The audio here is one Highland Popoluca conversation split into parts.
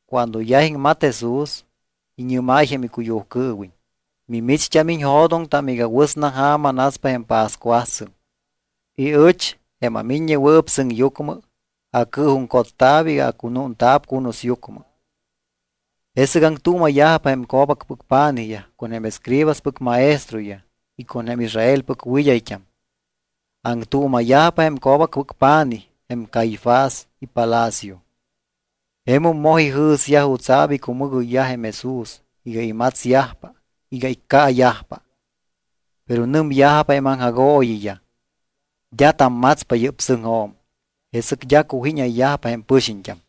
Cuando yaj iŋmat Jesús, iñɨ́máy jém icuyujcɨɨwiñ: —Mimicht́am iñjo̱doŋtam iga wɨsna ja̱ma naspa jém pascuasɨŋ y ɨch, jém aMiññewɨɨp Sɨŋyucmɨ, acɨɨjuŋcotta̱p iga acunúnta̱p cunusyucmɨ. Jesɨc aŋtuuma̱yajpa jém co̱bacpɨc pa̱nijyaj con jém escribaspɨc maestroyaj y con jém Israelpɨc wɨd́ayt́am. Aŋtuuma̱yajpa jém co̱bacpɨc pa̱nij, jém Caifás, ipalacio. Jemum moj ijɨ̱syaj jutsa̱p icumɨgoyyaj jém Jesús iga imatsyajpa iga iccaayajpa. Pero nɨmyajpa jém aŋjagooyiyaj: —D́a tammatspa yɨ́p sɨŋjo̱m, jesɨc d́a cujínayyajpa jém pɨxiñt́am.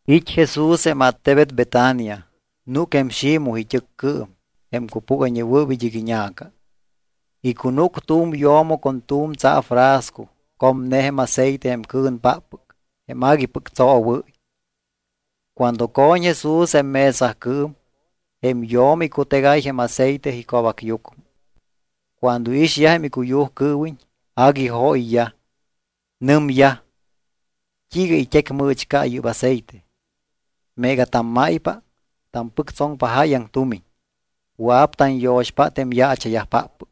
It́ Jesús jém attebet Betania, núc jém Ximoj it́ɨccɨɨm, jém cupúgayñewɨɨp id́ɨc iña̱ca. Icunúc tu̱m yo̱mo con tu̱m tsaafrasco comne jém aceite jém cɨ̱npáppɨc jém aguipɨc tsoowɨ́y. Cuando co̱ñ Jesús jém mesacɨɨm, jém yo̱mo icutegáy jém aceite ico̱bacyucmɨ. Cuando iixyaj jém icuyujcɨɨwiñ agui jóyyaj. Nɨmyaj: —¿T́iiga it́ecmɨ̱chca yɨ́p aceite? Meega tammáypa, tampɨctsoŋpa jáyaŋ tumiñ. Wɨa̱p tanyo̱xpátta jém yaacha̱yajpáppɨc.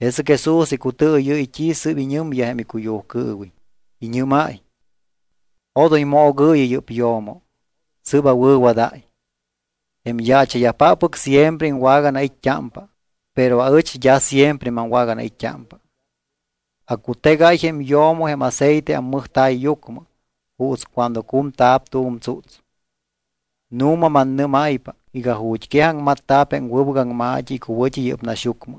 Jesɨc Jesús icutɨɨyɨ́y t́i sɨ́p iñɨmyaj jém icuyujcɨɨwiñ. Iñɨ́máy: —Odoy moogɨɨyɨ yɨ́p yo̱mo. Sɨ́p awɨ̱wadáy. Jém yaacha̱yajpáppɨc siempre iŋwaganait́t́ámpa. Pero aɨch d́a siempre maŋwaganait́t́ámpa. Acutegáy jém yo̱mo jém aceite ammɨjta̱yyucmɨ juuts cuando cumta̱p tu̱m tsúts. Nu̱ma mannɨ́máypa iga ju̱t́quej aŋmatta̱p jém wɨbɨc aŋma̱t́i icuwɨ̱t́i yɨ́p naxyucmɨ,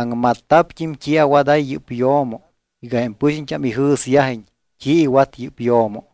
aŋmatta̱pt́im t́i awadáy yɨ́p yo̱mo iga jém pɨxiñt́am ijɨ̱syajiñ t́i iwat yɨ́p yo̱mo.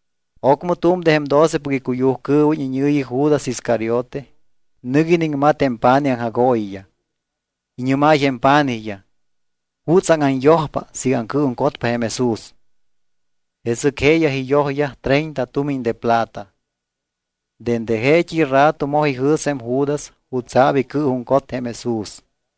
Ocmɨ tu̱m de jém docepɨc icuyujcɨɨwiñ iñɨ̱yi Judas Iscariote nɨc iniŋmat jém pa̱nij aŋjagooyiyaj. Iñɨ́máy jém pa̱nijyaj: —¿Jutsaŋ anyojpa siiga aŋcɨɨjuŋcotpa jém Jesús? Jesɨc jeeyaj iyojyaj treinta tumiñ de plata. Dende jeet́i rato moj ijɨ̱s jém Judas jutsa̱p icɨɨjuŋcot jém Jesús.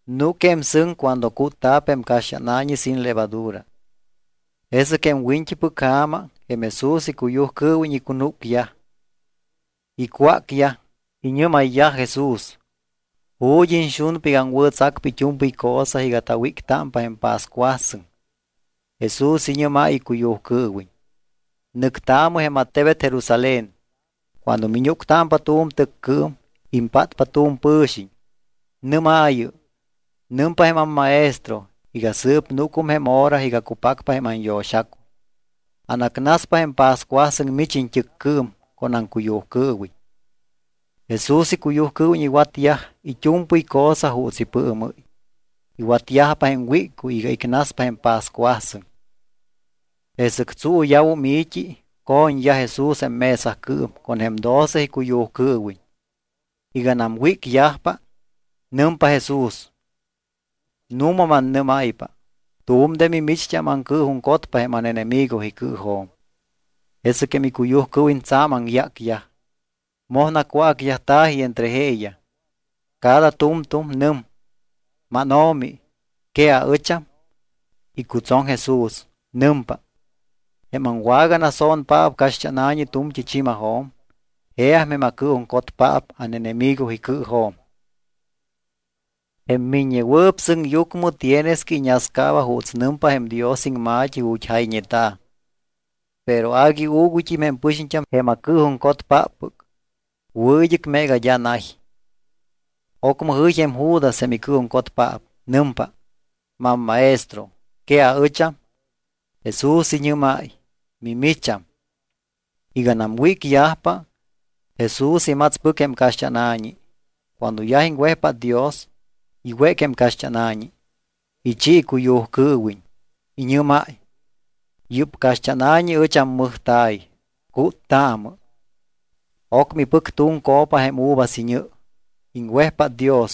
Núc jém sɨŋ cuando cútta̱p jém caxt́ána̱ñi sin levadura. Jesɨc jém wiñt́ipɨc ja̱ma jém Jesús icuyujcɨɨwiñ icunúcyaj. Icwácyaj, iñɨ́mayyaj Jesús: —¿Ju̱t́ iñxunpa iga aŋwɨ̱tsacpa it́u̱mpɨy cosa iga tawíctámpa jém pascuasɨŋ? Jesús iñɨ́máy icuyujcɨɨwiñ: —Nɨctaamɨ jém attebet Jerusalén. Cuando miñúctámpa tu̱m tɨccɨɨm, impátpa tu̱m pɨ̱xiñ. Nɨ́maayɨ: “Nɨmpa jém amMaestro iga sɨɨp núcum jém hora iga cupacpa jém anyo̱xacuy. Anacnaspa jém pascuasɨŋ mich iñt́ɨccɨɨm con aŋcuyujcɨɨwiñ.” Jesús icuyujcɨɨwiñ iwatyaj it́u̱mpɨy cosa juuts ipɨɨmɨ́y. Iwatyajpa jém wíccuy iga icnaspa jém pascuasɨŋ. Jesɨc tsuuya̱wum i̱t́i, co̱ñyaj Jesús jém mesacɨɨm con jém doce icuyujcɨɨwiñ. Iganam wícyajpa, nɨmpa Jesús: —Nu̱ma mannɨ́máypa, tu̱m de mimicht́am aŋcɨɨjuŋcotpa jém ánenemigo icɨɨjo̱m. Jesɨc jém icuyujcɨɨwiñ tsa̱m aŋyácyaj. Moj nacwácyajta̱ji entre jeeyaj. Cada tu̱mtu̱m nɨm: —MánO̱mi, ¿que aɨcham? Icutsoŋ Jesús. Nɨmpa: —Jém aŋwaganaso̱npaap caxt́ána̱ñi tu̱mt́i chi̱majo̱m, jeam jém acɨɨjuŋcotpaap ánenemigo icɨɨjo̱m. Jém Miññewɨɨp Sɨŋyucmɨ tienes que iñascaaba juuts nɨmpa jém Dios iŋma̱t́i ju̱t́ jayñeta̱, pero agui uuguyt́im jém pɨxiñt́am jém acɨɨjuŋcotpáppɨc, wɨ̱ id́ɨc meega d́a nay. Ocmɨ jɨy jém Judas jém icɨɨjuŋcotpaap. Nɨmpa: —MamMaestro, ¿que aɨcham? Jesús iñɨ́máy: —Mimicham. Iganam wícyajpa, Jesús imatspɨc jém caxt́ána̱ñi. Cuando yaj iŋwejpát Dios, iwéc jém caxt́ána̱ñi, ichi icuyujcɨɨwiñ. Iñɨ́máy: —Yɨ́p caxt́ána̱ñi ɨch ammɨjta̱y, cúttaamɨ. Ocmɨ ipɨc tu̱m copa jém uvas iñɨ, iŋwejpát Dios.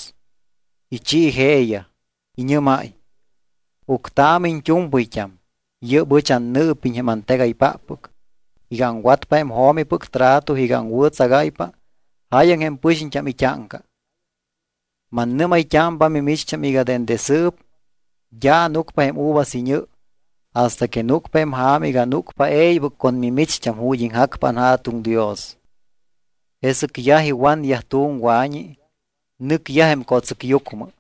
Ichi jeeyaj. Iñɨ́máy: —Uctaamɨ iñt́u̱mpɨyt́am. Yɨ́p ɨch annɨɨpiñ jém antegaypáppɨc iga aŋwatpa jém jo̱mipɨc trato iga aŋwɨ̱tsagáypa jáyaŋ jém pɨxiñt́am it́áŋca. Mannɨ́may-t́ámpa mimicht́am iga dende sɨɨp d́a ánucpa jém uvas iñɨ hasta que núcpa jém ja̱ma iga ánucpa e̱ybɨc con mimicht́am ju̱t́ iŋjacpa anJa̱tuŋ Dios. Jesɨc yaj iwanyaj tu̱m wa̱ñi, nɨcyaj jém co̱tsɨcyucmɨ.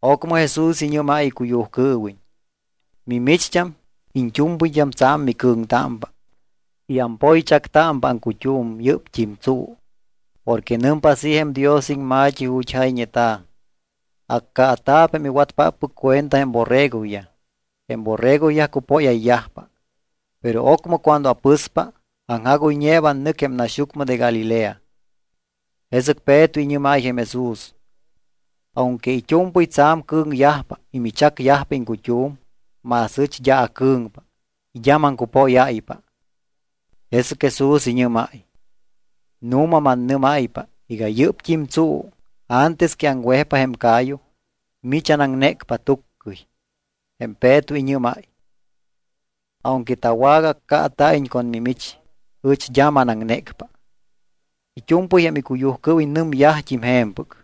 Ocmɨ Jesús iñɨ́máy icuyujcɨɨwiñ: —Mimicht́am iñt́u̱mpɨyt́am tsa̱m micɨ̱ŋtámpa y ampoychactámpa aŋcut́um yɨ́pt́im tsuu. Porque nɨmpa así jém Dios iŋma̱t́i ju̱t́ jayñeta̱: “Accaata̱p jém iwatpáppɨc cuenta jém borregoyaj. Jém borregoyaj cupóyayyajpa.” Pero ocmɨ cuando apɨspa, aŋjagoyñeeba annɨc jém naxyucmɨ de Galilea. Jesɨc Peto iñɨ́máy jém Jesús: —Aunque it́u̱mpɨy tsa̱m cɨ̱ŋyajpa y michacyajpa iŋcut́um, más aɨch d́a acɨ̱ŋpa y d́a maŋcupóyáypa. Jesɨc Jesús iñɨ́máy: —Nu̱ma mannɨ́máypa iga yɨ́pt́im tsuu antes que aŋwejpa jém ca̱yu mich anaŋnécpa tuccɨy. Jém Peto iñɨ́máy: —Aunque tawagaaccaata̱iñ con mimich, ɨch d́a manaŋnécpa. It́u̱mpɨy jém icuyujcɨɨwiñ nɨmyajt́im je̱mpɨc.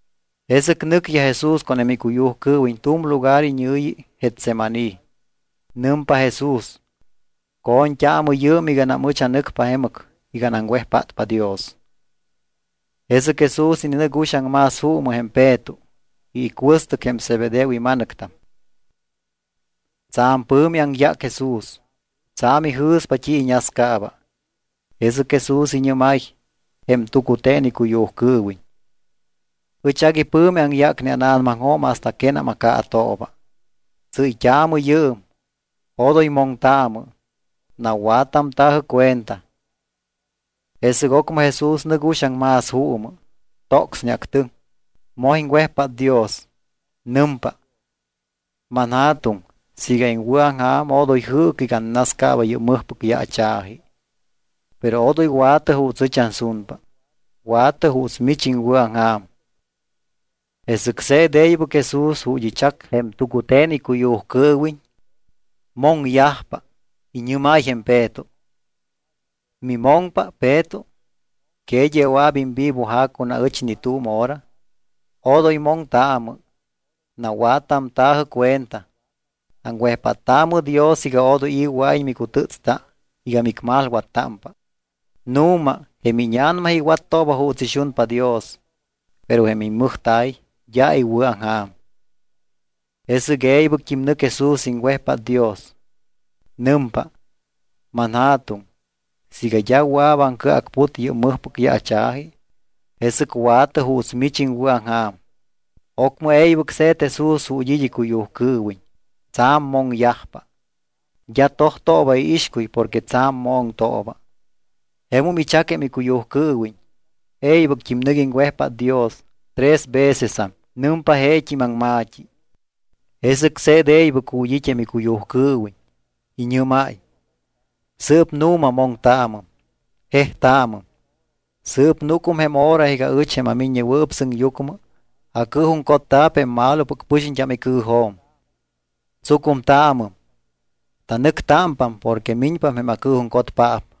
Jesɨc nɨcyaj Jesús con jém icuyujcɨɨwiñ tu̱m lugar iñɨ̱yi Getsemaní. Nɨmpa Jesús: —Co̱ñt́aamɨ yɨɨm iganam ɨch anɨcpa jemɨc iga anaŋwejpátpa Dios. Jesɨc Jesús ininɨc uxaŋ más juumɨ jém Peto y icuɨstɨc jém Zebedeo ima̱nɨctam. Tsa̱m pɨ̱mi aŋyác Jesús, tsa̱m ijɨ̱spa t́i iñascaaba. Jesɨc Jesús iñɨ́máy jém tucute̱n icuyujcɨɨwiñ: —Ɨch agui pɨ̱mi aŋyácne ána̱namaŋjo̱m hasta quénam acaatooba. Tsɨ́yt́aamɨ yɨɨm, odoy moŋtaamɨ, nawattamta̱jɨ cuenta. Jesɨc ocmɨ Jesús nɨc uxaŋ más juumɨ. Tocsneactɨŋ. Moj iŋwejpát Dios. Nɨmpa: —ManJa̱tuŋ, siiga iŋwɨ̱aŋja̱m odoy jɨɨcɨ iga annascaaba yɨ́p mɨjpɨc yaacha̱ji. Pero odoy wa̱tɨ juuts ɨch ansunpa. Wa̱tɨ juuts mich iŋwɨ̱aŋja̱m. Jesɨc se̱t e̱ybɨc Jesús ju̱t́ ichac jém tucute̱n icuyujcɨɨwiñ. Moŋyajpa. Iñɨ́máy jém Peto: —¿Mimoŋpa Peto? ¿Que d́a wɨa̱p imvivoja̱ con aɨch ni tu̱m hora? Odoy moŋtaamɨ, nawattamta̱jɨ cuenta. Aŋwejpáttaamɨ Dios iga odoy i̱ wɨa̱iñ micutɨ́tsta iga micmalwattámpa. Nu̱ma, jém íña̱nama iwattooba juuts ixunpa Dios, pero jém immɨjta̱y d́a iwɨ̱aŋja̱m. Jesɨc e̱ybɨct́im nɨc Jesús iŋwejpát Dios. Nɨmpa: —ManJa̱tuŋ, siiga d́a wɨa̱p aŋcɨacput yɨ́p mɨjpɨc yaacha̱ji, jesɨc wa̱tɨ juuts mich iŋwɨ̱aŋja̱m. Ocmɨ e̱ybɨc se̱t Jesús ju̱t́ it́ icuyujcɨɨwiñ. Tsa̱m moŋyajpa. D́a tojtooba iixcuy porque tsa̱m moŋtooba. Jemum ichac jém icuyujcɨɨwiñ. E̱ybɨct́im nɨc iŋwejpát Dios tres vecesam. Nɨmpa jeet́im aŋma̱t́i. Jesɨc se̱t e̱ybɨc ju̱t́ it́ jém icuyujcɨɨwiñ. Iñɨ́máy: —Sɨɨp nu̱ma moŋtaamɨm, jejtaamɨm. Sɨɨp núcum jém hora iga ɨch, jém aMiññewɨɨp Sɨŋyucmɨ, acɨɨjuŋcotta̱p jém malopɨc pɨxiñt́am icɨɨjo̱m. Tsucumtaamɨm, tanɨctámpam porque miñpam jém acɨɨjuŋcotpaap.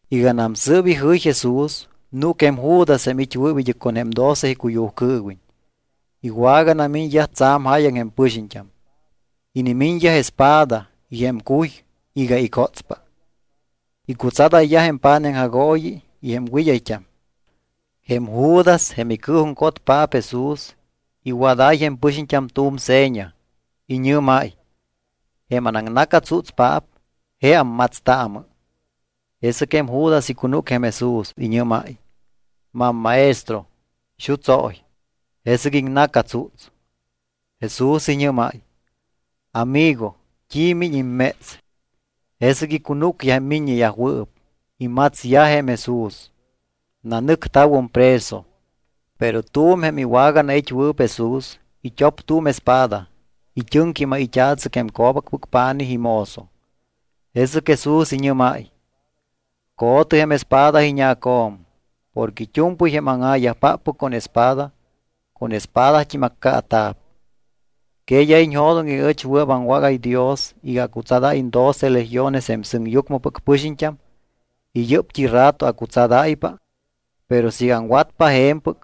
Iganam sɨ́p ijɨy Jesús, núc jém Judas jém it́wɨɨp id́ɨc con jém doce icuyujcɨɨwiñ. Iwaganamiñyaj tsa̱m jáyaŋ jém pɨxiñt́am. Inimiñyaj espada y jém cuy iga icótspa. Icutsadayyaj jém pa̱nij aŋjagooyi y jém wɨd́ayt́am. Jém Judas, jém icɨɨjuŋcotpaap Jesús, iwadáy jém pɨxiñt́am tu̱m seña. Iñɨ́máy: —Jém anaŋna̱catsútspaap, jeam. Matstaamɨ. Jesɨc jém Judas icunúc jém Jesús. Iñɨ́máy: —MamMaestro, xutsóy. Jesɨc iŋna̱catsúts. Jesús iñɨ́máy: —¿Amigo, t́i miñ imméts? Jesɨc icunúcyaj jém miññeyajwɨɨp. Imatsyaj jém Jesús. Nanɨcta̱wum preso. Pero tu̱m jém iwaganait́wɨɨp Jesús, it́op tu̱m espada, it́ɨŋquímáy it́a̱tsɨc jém co̱bacpɨc pa̱nij imozo. Jesɨc Jesús iñɨ́máy: —Co̱tɨ jém espada iñacjo̱m. Porque it́u̱mpɨy jém áŋa̱yajpáppɨc con espada, con espadat́im accaata̱p. ¿Que d́a iñjo̱doŋ iga ɨch wɨa̱p aŋwágáy Dios iga acutsadáyiñ doce legiones jém sɨŋyucmɨpɨc pɨxiñt́am y yɨ́pt́i rato acutsadáypa? Pero siiga aŋwatpa je̱mpɨc,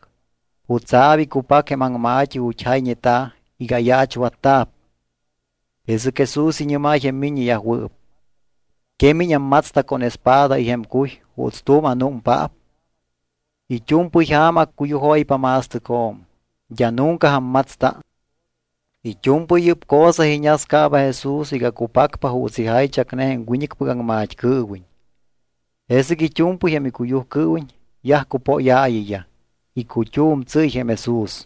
¿jutsa̱p icupac jém aŋma̱t́i ju̱t́ jayñeta̱ iga ayaachwatta̱p? Jesɨc Jesús iñɨ́máy jém miññeyajwɨɨp: —¿Que miñ ammatsta con espada y jém cuy juuts tu̱m anúmpaap? It́u̱mpɨy ja̱ma accuyujóypa ma̱stɨcjo̱m, d́a nunca ammatsta. It́u̱mpɨy yɨ́p cosa iñascaaba Jesús iga cupacpa juuts ijaychacne jém wiñɨcpɨc aŋmat́cɨɨwiñ. Jesɨc it́u̱mpɨy jém icuyujcɨɨwiñ yaj cupóyaayiyaj. Icut́um tsɨ́y jém Jesús.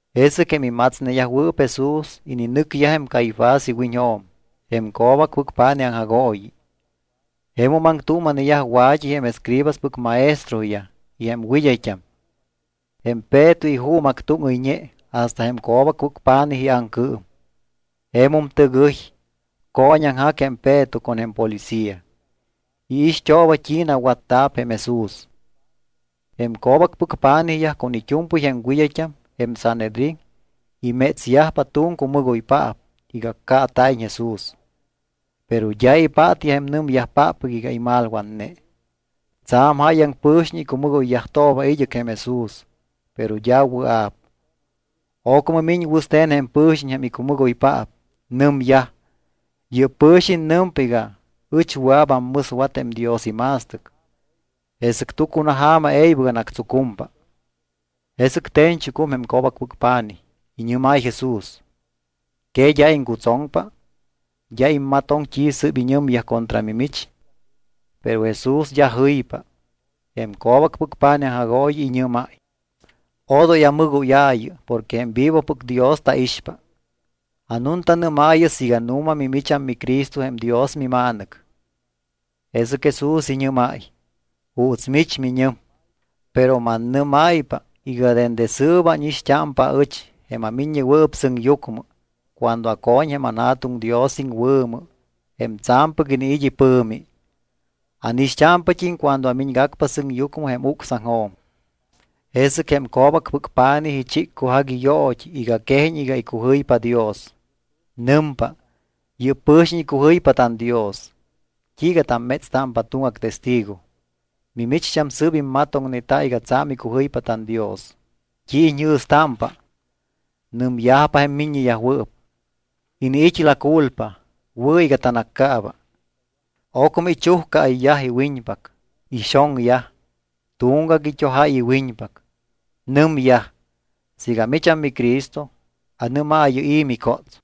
Jesɨc jém imatsneyajwɨɨp Jesús ininɨcyaj jém Caifás iwiñjo̱m, jém co̱bacpɨc pa̱nij aŋjagooyi. Jemum aŋtuuma̱neyaj wa̱t́i jém escribaspɨc maestroyaj y jém wɨd́ayt́am. Jém Peto ijuumactúŋɨyñe hasta jém co̱bacpɨc pa̱nij iaŋcɨɨm. Jemum tɨgɨy, cooñaŋjac jém Peto con jém policía. Iixt́ooba t́i nawatta̱p jém Jesús. Jém co̱bacpɨc pa̱nijyaj con it́u̱mpɨy jém wɨd́ayt́am, jém Sanhedrín, imétsyajpa tu̱m cumɨgoypaap iga accaata̱iñ Jesús. Pero d́a ipátyaj jém nɨmyajpáppɨc iga imalwatne. Tsa̱m jáyaŋ pɨ̱xiñ icumɨgoyyajtooba id́ɨc jém Jesús, pero d́a wɨa̱p. Ocmɨ miñ wɨste̱n jém pɨ̱xiñ jém icumɨgoypaap. Nɨmyaj: —Yɨ́p pɨ̱xiñ nɨmpa iga: “Ɨch wɨa̱p ammɨswat jém Dios ima̱stɨc, jesɨc tucunaja̱ma e̱ybɨc anactsucumpa.” Jesɨc te̱ñchucum jém co̱bacpɨc pa̱nij, iñɨ́máy Jesús: —¿Que d́a iŋcutsoŋpa? ¿D́a immatoŋ t́i sɨ́p iñɨmyaj contra mimich? Pero Jesús d́a jɨypa. Jém co̱bacpɨc pa̱nij aŋjagooyi iñɨ́máy: —Odoy amɨgóyaayɨ porque jém vivopɨc Dios taixpa. Anuntanɨ́maayɨ siiga nu̱ma mimicham miCristo jém Dios miMa̱nɨc. Jesɨc Jesús iñɨ́máy: —Juuts mich miñɨm. Pero mannɨ́máypa iga dende sɨɨp ánixt́ámpa aɨch, jém aMiññewɨɨp Sɨŋyucmɨ, cuando aco̱ñ jém tanJa̱tuŋ Dios iŋwɨ̱mɨ, jém tsa̱mpɨc iniit́ ipɨ̱mi. Ánixt́ámpat́im cuando amiñgacpa sɨŋyucmɨ jém ucsaŋjo̱m. Jesɨc jém co̱bacpɨc pa̱nij ichiccujac iyoot́i iga quejiñ iga icujɨypa Dios. Nɨmpa: —Yɨ́p pɨ̱xiñ icujɨypa tanDios. ¿T́iiga tammétstámpa tuŋgac testigo? Mimicht́am sɨɨp immatoŋneta iga tsa̱m icujɨypa tanDios. ¿T́i iñjɨ̱stámpa? Nɨmyajpa jém miññeyajwɨɨp: —Iniit́ la culpa. Wɨ̱ iga tanaccaaba. Ocmɨ ichujcaayyaj iwiñpac. Ixoŋyaj. Tuŋgac it́ojáy iwiñpac. Nɨmyaj: —Siiga micham miCristo, anɨ́maayɨ i̱ micóts.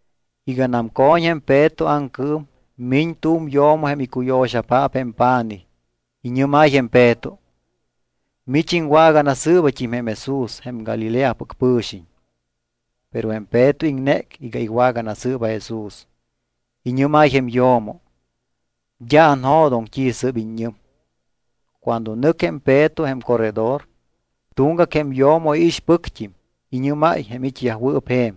Iganam co̱ñ jém Peto aŋcɨɨm, miñ tu̱m yo̱mo jém icuyo̱xapaap jém pa̱nij. Iñɨ́máy jém Peto: —Mich iŋwaganasɨɨbat́im jém Jesús, jém Galileapɨc pɨ̱xiñ. Pero jém Peto iŋnéc iga iwaganasɨɨba Jesús. Iñɨ́máy jém yo̱mo: —D́a anjo̱doŋ t́i sɨ́p iññɨm. Cuando nɨc jém Peto jém corredor, tuŋgac jém yo̱mo iixpɨct́im, iñɨ́máy jém it́yajwɨɨp je̱m: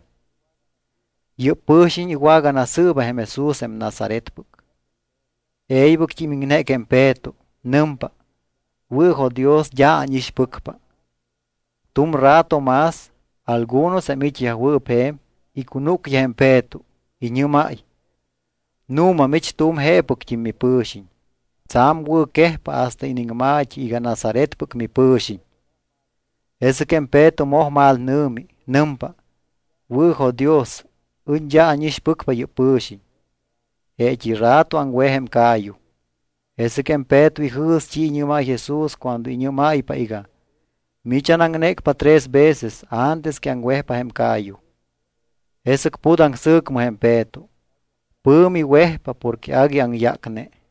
—Yɨ́p pɨ̱xiñ iwaganasɨɨba jém Jesús jém Nazaretpɨc. E̱ybɨct́im iŋnéc jém Peto. Nɨmpa: —Wɨ̱jo̱dios, d́a ánixpɨcpa. Tu̱m rato más, algunos jém it́yajwɨɨp je̱m, icunúcyaj jém Peto, iñɨ́máy: —Nu̱ma mich tu̱m jeepɨct́im mipɨ̱xiñ, tsa̱m wɨ̱quejpa hasta iniŋma̱t́i iga Nazaretpɨc mipɨ̱xiñ. Jesɨc jém Peto moj malnɨ̱mi. Nɨmpa: —Wɨ̱jo̱dios, ɨch d́a ánixpɨcpa yɨ́p pɨ̱xiñ. Jeet́i rato aŋwej jém ca̱yu. Jesɨc jém Peto ijɨ̱s t́i iñɨ́máy Jesús cuando iñɨ́máypa iga: “Mich anaŋnécpa tres veces antes que aŋwejpa jém ca̱yu.” Jesɨc put aŋsɨ̱cmɨ jém Peto. Pɨ̱mi wejpa porque agui aŋyácne.